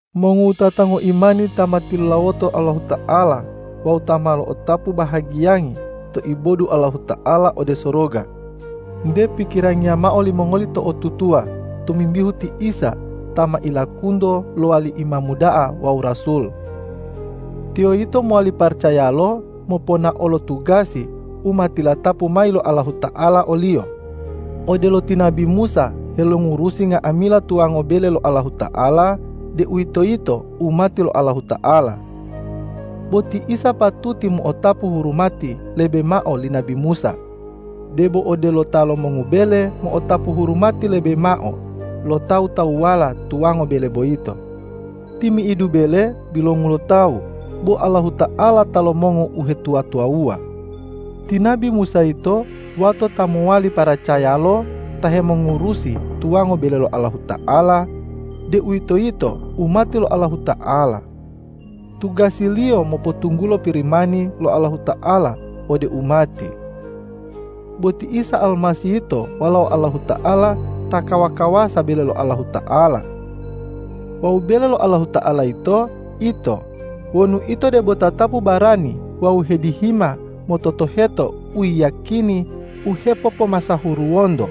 Mongowutata ngoimani ta ma tilulawoto Allahuta'ala wawu ta ma lo'otapu bahagiyangi to ibodu Allahuta'ala ode soroga, nte pikirangiya mao limongoli to'otutuwa tomimbihu ti Isa ta ma ilakunto lowali Imamu da'a wawu Rasul. Tiyo yito mowali paracayalo moponao lo tugasi u ma tilatapu mayi lo Allahuta'ala o-Liyo, odelo ti nabi Musa helongurusi nga'amila tuwango bele lo Allahuta'ala, deuwitoyito umati lo Allahuta'ala. Bo ti Isa patuti mo'otapu hurumati lebe mao li nabi Musa, debo odelo ta lomongu bele mo'otapu hurumati lebe mao lo tawu-tawuwala tuwango bele boyito. Timi'idu bele bilongu lo tawu, bo Allahuta'ala ta lomongu uhetuwa-tuwawuwa. Ti nabi Musa yito wato ta mowali paracayalo ta hemongurusi tuwango bele lo Allahuta'ala, deuwitoyito umati lo Allahuta'ala. Tugasiliyo mopotunggulo Pirimani lo Allahuta'ala ode umati. Bo ti Isa Almasih yito Walao Allahuta'ala ta kawa-kawasa bele lo Allahuta'ala. Wawu bele lo Allahuta'ala yito ito wonu ito debo tatapu barani wawu hedihima mototoheto uyiyakini u hepopomasahuruwonto.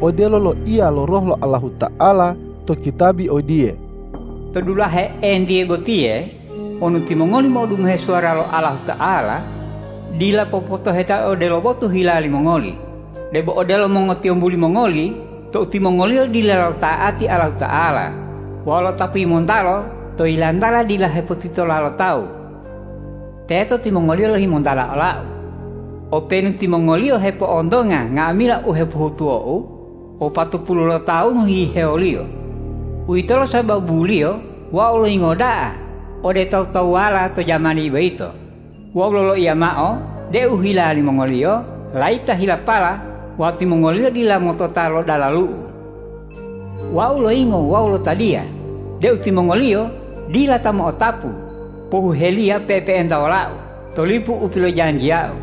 Odelo loiya lo Roh lo Allahuta'ala to kitabi odiye,”To dulahe entiye botiye wonu timongoli mo'odungohe suwara lo Allahuta'ala, dila popotoheta odelo botu hila limongoli, debo odelo mongotiyombu limongoli tou timongoliyo dila lota'ati Allahuta'ala wawu lo'otapu yimontalo to yilantala dila hepotitola lo tawu. Teto timongoliyo lohimontala ola-U, openu timongoliyo hepo'ontonga nga'amila u hepohutuwo-U wopatopulu lotawunu hihewoliyo. Uwitolo sababuliyo Wau loyingo da'a ode tawu-tawuwala to jamani boyito wawu loloiya mao deu hila limongoliyo layito helapala wawu timongoliyo dila motota lo dalalu-U. Wau loyingo wawu lotadiya deu timongoliyo dila ta mo'otapu pohuheliya pe'epe'enta wola-U to lipu u pilojanjiya-U,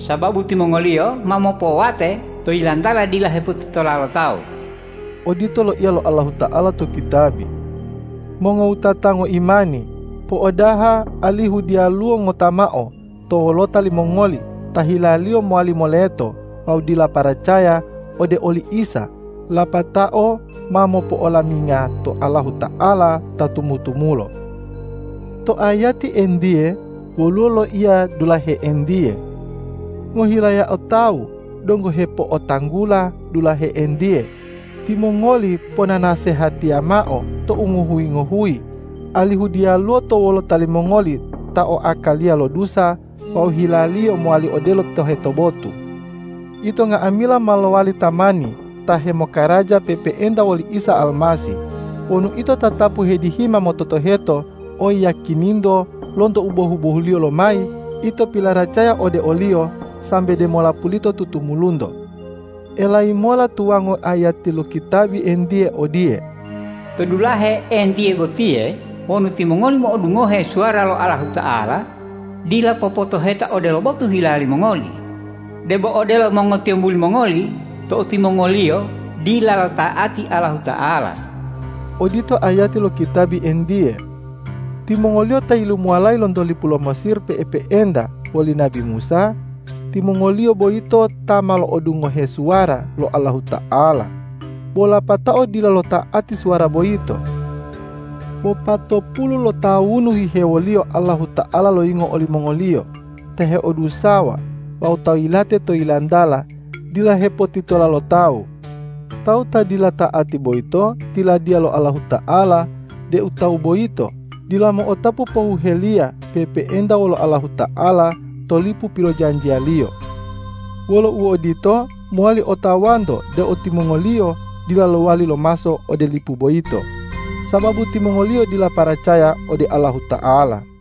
sababu timongoliyo ma mopowate to yilantala dila hepotitola lo tawu.” Odito loiya lo Allahuta'ala to kitabi. Mongowutata ngoimani, po'odaha alihu diyaluwo ngota mao to wolota limongoli ta hilaliyo mowali moleto wawu dila paracaya ode oli Isa lapatao ma mopo'olaminga to Allahuta'ala ta tumu-tumulo! To ayati entiye woluwo loiya dulahe entiye. Ngohilayao tawu donggo hepo'otanggula dulahe entiye, timongoli ponanasehatiya mao tou ngohuyi-ngohuyi, alihu diyaluwo to wolota limongoli ta oakaliya lo dusa wawu hilaliyo mowali odelo toheto botu. Ito nga'amila ma lowali tamani ta hemokaraja pe'epe'enta woli Isa Almasih wonu ito tatapu hedihima mototoheto oyiyakininto lonto u bohu-bohuliyo lomayi ito pilaracaya ode o-Liyo sambe demola pulito tutumulunto. Elayi mola tuwango ayati lo kitabi entiye odiye,”To dulahe entiye botiye wonu timongoli mo'odungohe suwara lo Allahuta'ala, dila popotoheta odelo botu hila limongoli, debo odelo mongotiyombu limongoli tou timongoliyo dila lota'ati Allahuta'ala.” Odito ayati lo kitabi entiye. Timongoliyo ta yilumuwalayi lonto lipu lo Mesir pe'epe'enta woli nabi Musa, timongoliyo boyito ta ma lo'odungohe suwara lo Allahuta'ala, bo lapatao dila lota'ati suwara boyito. Wopatopulu lotawunu hihewoliyo Allahuta'ala loyingo olimongoliyo ta heodusawa wawu ta yilate to yilantala dila hepotitola lo tawu. Tawu ta dila ta'ati boyito, tiladiya lo Allahuta'ala deu tawu boyito dila mo'otapu pohuheliya pe'epe'enta wolo Allahuta'ala to lipu pilojanjiya-Liyo. Wolo uodito, mowali otawanto deu timongoliyo dila lowali lomaso ode lipu boyito, sababu timongoliyo dila paracaya ode Allahuta'ala.